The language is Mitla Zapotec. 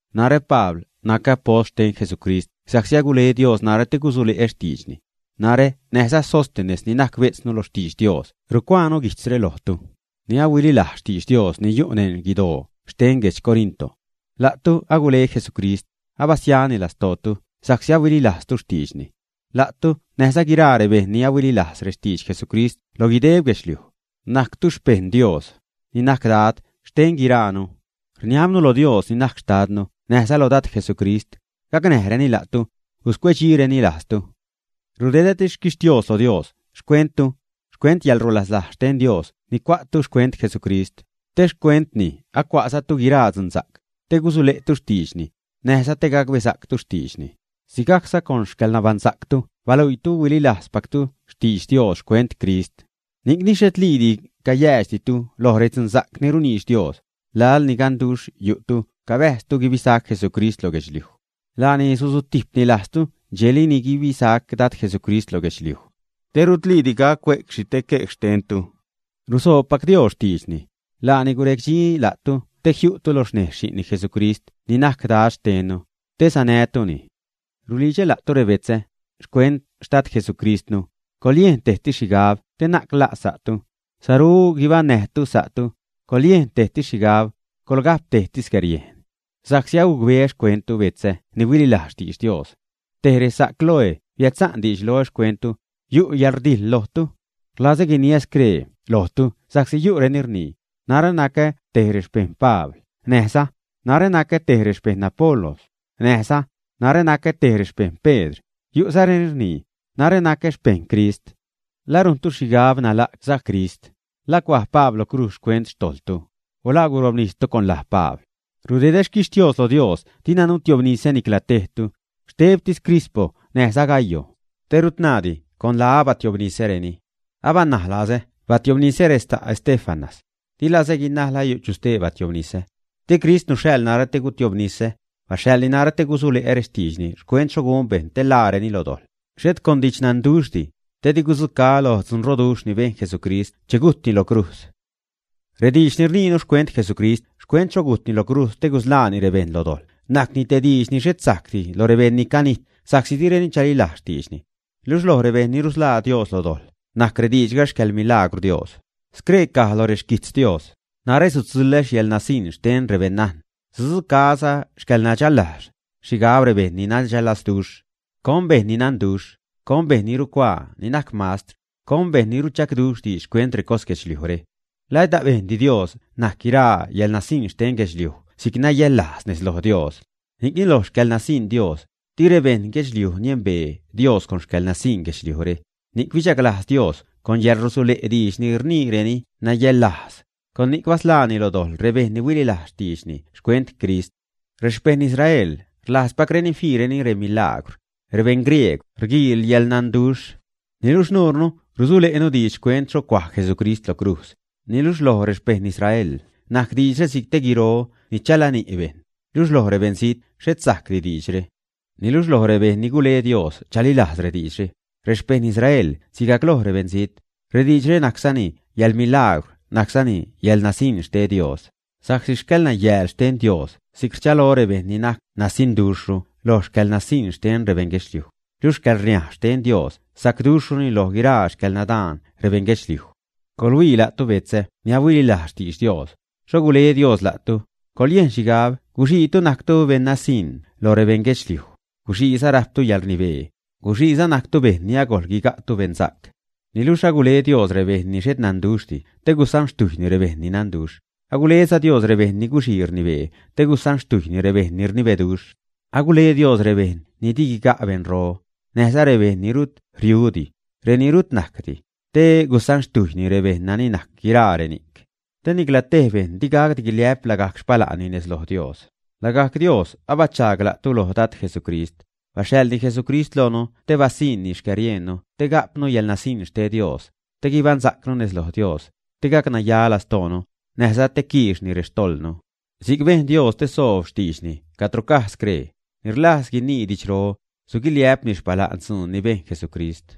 Narä Pabl nacä apost xten Jesucrist sa'csi agule Dios narä te gusule'ä xtiidxni. Narä näjza Sóstenes ni najc bejtznu lo xtidx Dios rucuaanu guijtzre lojtu ni ahuililajz xtidx Dios, ni yu' neṉ guidoo xten guedx Corinto. La'tu agule Jesucrist, abasiani lastootu sa'csi ahuililajztu xtiidxni. La'tu näjza guiraa rebejṉ ni ahuililajz rextidx Jesucrist loj guideb guedxliuj, najctu xpejṉ Dios, ni najc Dad xten guiraanu. Rniabnu lo Dios ni najc xtadnu näjza lo Dad Jesucrist, gacnäjreni la'tu, guscuecdxireni lajztu. Rudedätis xquixtios lo Dios xcuentu, xcuent yäḻrulaslajz xten Dios ni cua'tu xcuent Jesucrist, te xcuentni acua'zatu guiraa dzunsa'c, te gusule'tu xtiidxni, näjza te gacbesa'ctu xtiidxni; sigajcza con xcäḻnabaṉsa'ctu baluiitu huililajzpactu xtidx Dios xcuent Crist. Ni'cni xhetliidi cayäädxditu loj redzunsa'c ni runiidx Dios, laḻ ni ganduxh yu'tu cabäjztu guibisac Jesucrist lo guedxliuj. Laani susutijpni lajztu dxejli ni guibisac Dad Jesucrist loj guedxliuj, te rutliidi gac cue'c xhi te quej xcuenttu. Rusoobpac Dios xtiidxni. Laani gurejdxni la'tu te jiu'tu lo xnejz Xi'nni Jesucrist ni najc Dad xtennu, te sanäjtuni. Rulidxä la'tu, rebetzä, xcuent Xtad Jesucristnu, coḻyejn tejsi xhigab te na'c la' sa'tu, saru guibaṉnäjtu sa'tu, coḻyejn tejsi xhigab, coḻga'p tejsi xcäriejn. Sa'csi agucbeä xcuenttu, betzä ni huililajz xtidx Dios. Tej resa' Cloé biädsa'n diidx loä xcuenttu, yu' yäḻrdijḻ lojtu. Rlazä guiniä scree lojtu sa'csi yu'reni rnii: “Narä nacä te rexpejṉ Pabl”, näjza: “Narä nacä te rexpejṉ Apolos”; näjza: “Narä nacä te rexpejṉ Pedr”, yu'zareni rnii: “Narä nacä xpejṉ Crist.” ¿La rujntu xhigab nala' sa' Crist, ä? ¿La cuaj Pabl lo crujz xcuent xtojḻtu, ä? o ¿La gurobnistu con laj Pabl, ä? Rudedä xquixtios lo Dios dina nutiobnisä nicla tejtu, xtebtis Crispo näjza Gayo, te rut naadi con laä batiobnisäreni. Abanaj lazä batiobnisä resa' Estéfanas. Di lazä guinaj la yu' chu stee bationnisä. Di Crist nuxhaḻ narä te gutiobnisä. Baxhaḻni narä te gusule'ä rextiidxni xcuent xho gun bejṉ te ḻaareni lo dojḻ, xhet con didxnanduxhdi, te di gudzucaä loj dzunroduxh ni bejn Jesucrist che gujtni lo crujz. Rediidx ni rniinu xcuent Jesucrist xcuent xho gujtni lo crujz te gusḻaani rebejṉ lo dojḻ najcni te diidx ni xhet sajcdi lo rebejṉ ni canijt sa'csi direni chalilajz xtiidxni. Luxh loj rebejṉ ni rusḻaa Dios lo dojḻ najc rediidxga xcäḻmilaagwr Dios. Scree caj loj rexquijtz Dios: Narä sutzuḻä yäḻnasiṉ xten rebeṉnajn, sudzucaäza xcäḻnadxällajz, xhigab rebejṉ ni nadxällazduxh. ¿Con bejṉ ni nanduxh? ¿Con bejṉ ni rucuaa, ni najc mastr? ¿Con bejṉ ni ruchagduxh diidx xcuent recos guedxliujre, ä? ¿La et abejndi Dios najc guiraa yäḻnasiṉ xten guedxliuj si'c nayäḻlajz nez loj Dios, ä? Ni'cni loj xcäḻnasiṉ Dios, di rebejṉ guedxliuj niembee Dios con xcäḻnasiṉ guedxliujre, ni'c bichaglajz Dios con yäḻrusule' diidx ni rniireni nayäḻlajz, con ni'c basḻaani lo dojḻ rebejṉ ni huililajz xtiidxni xcuent Crist. Rexpejṉ Israel rlajzpacreni fiireni remilaagwr; rebejṉ griegw rguiil yäḻnanduxh. Niluxh nuurnu rusule'nu diidx xcuent xho cuaj Jesucrist lo crujz, niluxh loj rexpejṉ Israel najc diidxre si'c te guiro ni chalani' bejṉ, luxh loj rebeṉzijt xhet sajcdi rediidxre. Niluxh loj rebejṉ ni gule Dios chalilajz rediidxre, rexpejṉ Israel sigajc loj rebeṉzijt, rediidxre najczani yäḻmilaagwr najczani yäḻnasiṉ xten Dios. Sa'csi xcäḻnayääl xten Dios si'c rchalo rebejṉ ni'c najc nasiṉduxhru loj xcäḻnasiṉ xten rebeṉ guedxliuj; luxh xcäḻrniaj xten Dios sacduxhruni loj guiraa xcäḻnadaan rebeṉ guedxliuj. Coḻhuii la'tu, betzä ni ahuililajz xtidx Dios, xho gule Dios la'tu, coḻyejn xhigab guxiitu najctu beṉ nasiṉ loj rebeṉ guedxliuj, guxiiza rajptu yäḻrnibee, guxiizatu najctu bejṉ ni agojl guiga'tu beṉsa'c. Niluxh agule Dios rebejṉ ni xhet nanduxhdi te gusanxtujyni rebejṉ ni nanduxh, aguleza Dios rebejṉ ni guxii rnibee te gusanxtujyni rebejṉ ni rnibeduxh. Agule Dios rebejṉ ni di guiga' beṉro, näjza rebejṉ ni rut riudi, reni rut najcdi, te gusanxtujyni rebejṉ nani najc guiraa reni'c. Te nicla tej bejṉ digacdi guiliä'p lagajc xpala'nni nez loj Dios. Lagajc Dios abachaag la'tu loj Dad Jesucrist; baxhaḻzani Jesucrist loonu te basanijni xcäriejnnu te ga'pnu yäḻnasiṉ xten Dios, te guibaṉsa'cnu nez loj Dios, te gacnaya lastoonu, näjza te quiixni rextojḻnu. Si'c bejn Dios te soob xtiidxni cadro caj scree: Ni rlajz guinii didxro, suguiliä'pni xpala'n dzuun ni bejn Jesucrist.